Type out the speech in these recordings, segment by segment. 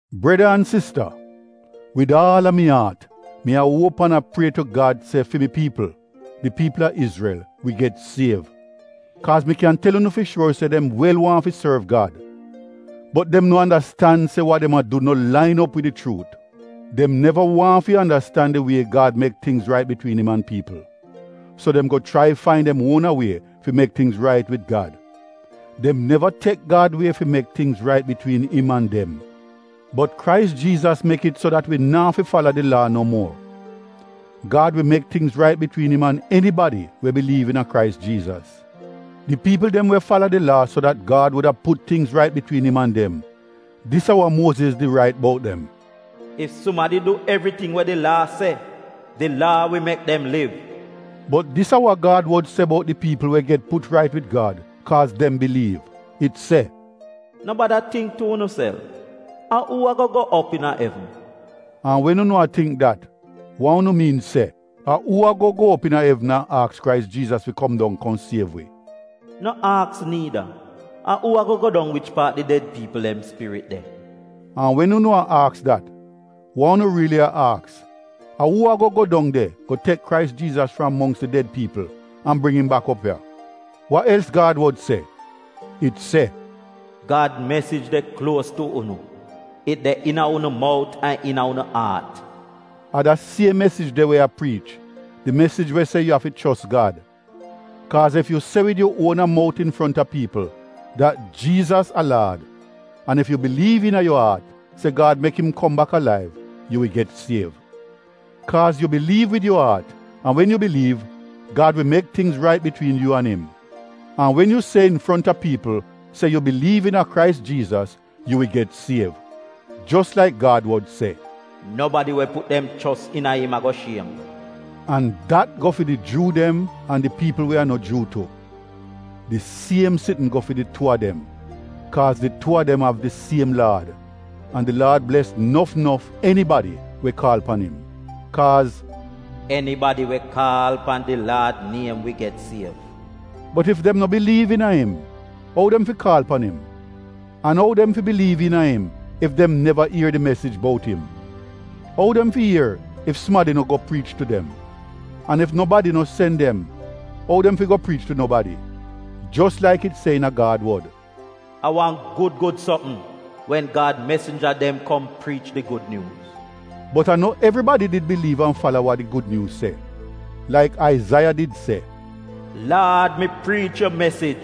Breda an sista, wid aal a mi aat mi a uop an a prie tu Gad se fi mi piipl, di piipl a Izrel, wi get siev. Kaaz mi kyan tel unu fi shuor se dem wel waahn fi sorv Gad. Bot dem no andastan se wa dem a du no lain op wid di chuut. Dem neva waahn fi andastan di wie Gad mek tingz rait bitwiin im an piipl, so dem go chrai fain dem uona wie fi mek tingz rait wid Gad; dem neva tek Gad wie fi mek tingz rait bitwiin im an dem. Bot Krais Jiizas mek it so dat wi naa fi fala di Laa no muor; Gad wi mek tingz rait bitwiin im an enibadi we biliiv iina Krais Jiizas. Di piipl dem we fala di Laa so dat Gad wuda put tingz rait bitwiin im an dem, dis a wa Muoziz did rait bout dem: “Ef sumadi du evriting we di Laa se, di Laa wi mek dem liv.” Bot dis a wa Gad wod se bout di piipl we get put rait wid Gad kaaz dem biliiv, it se: “No bada tingk tu unuself, ‘A uu ago go op iina evn?’” (an wen unu a tingk dat, wa unu miin se, a uu ago go op iina evn an aks Krais Jiizas fi kom dong kom siev wi.) “No aks niida, ‘A uu ago go dong wich paat di ded piipl dem spirit de?’” (an wen unu a aks dat, wa unu riili a aks a uu ago go dong de go tek Krais Jiizas fram mongks di ded piipl an bring im bak op ya.) Wa els Gad wod se? It se: “Gad mesij de kluos tu unu, it de iina unu mout an iina unu aat.” A da siem mesij de wi a priich; di mesij we se yu afi chos Gad. Kaaz ef yu se wid yu uona mout infronta piipl dat “Jiizas a Laad” an ef yu biliiv iina yu aat se Gad mek im kom bak alaiv, yu wi get siev. Kaaz yu biliiv wid yu aat an wen yu biliiv, Gad wi mek tingz rait bitwiin yu an im; an wen yu se infronta piipl se yu biliiv iina Krais Jiizas, yu wi get siev. Jos laik Gad wod se, “Nobadi we put dem chos iina im ago shiem,” an dat go fi di Juu dem an di piipl we a no Juu tu. Di siem sitn go fi di tuu a dem kaaz di tuu a dem av di siem Laad, an di Laad bles nof nof enibadi we kaal pan im. Kaaz “Enibadi we kaal pan di Laad niem wi get siev.” Bot ef dem no biliiv iina im, ou dem fi kaal pan im? An ou dem fi biliiv iina im ef dem neva ier di mesij bout im? Ou dem fi ier ef sumadi no go priich tu dem? An ef nobadi no sen dem, ou dem fi go priich tu nobadi? Jos laik it se iina Gad wod, “A wan gud gud sopm wen Gad mesinja dem kom priich di Gud Nyuuz.” Bot a no evribadi did biliiv an fala wa di Gud Nyuuz se. Laik Aizaiya did se “Laad, mi priich yu mesij,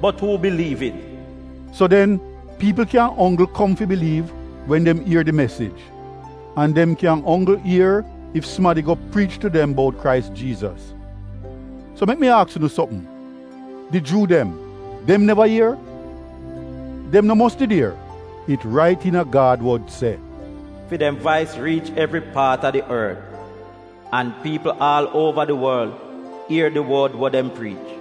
bot uu biliiv it?” So den, piipl kyan onggl kom fi biliiv wen dem ier di mesij, an dem kyan onggl ier, ef sumadi go priich tu dem bout Krais Jiizas. So mek mi aks unu sopm, di Juu dem, dem neva ier? Dem no mos did ier! It rait iina Gad wod se, “Fi dem vais riich evri paat a di ort, an piipl aal uova di worl ier di wod we dem priich.”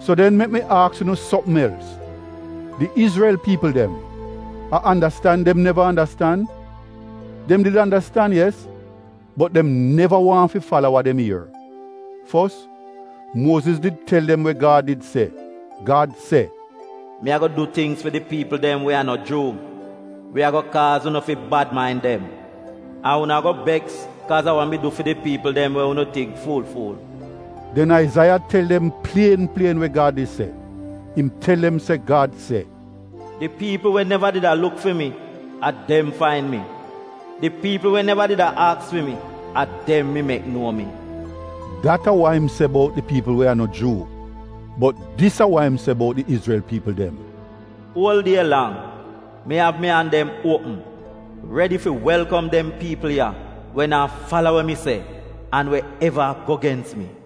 So den mek mi aks unu sopm els: Di Izrel piipl dem, a andastan dem neva andastan? Dem did andastan, yes, bot dem neva waahn fi fala wa dem ier. Fos, Muoziz did tel dem we Gad did se. Gad se, “Mi ago du tingz fi di piipl dem we a no Juu, we ago kaaz unu fi bad main dem; an unu ago beks kaaz a wa mi du fi di piipl we unu tingk fuul-fuul.” Den Aizaiya tel dem plien plien we Gad did se, im tel dem se Gad se, “Di piipl we neva did a luk fi mi, a dem fain mi; di piipl we neva did a aks fi mi, a dem mi mek nuo mi.” Dat a wa im se bout di piipl we a no Juu, bot dis a wa im se bout di Izrel piipl dem, “Uol die lang, mi av mi an dem uopm, redi fi welkom dem piipl ya we naa fala wa mi se an we eva a go gens mi.”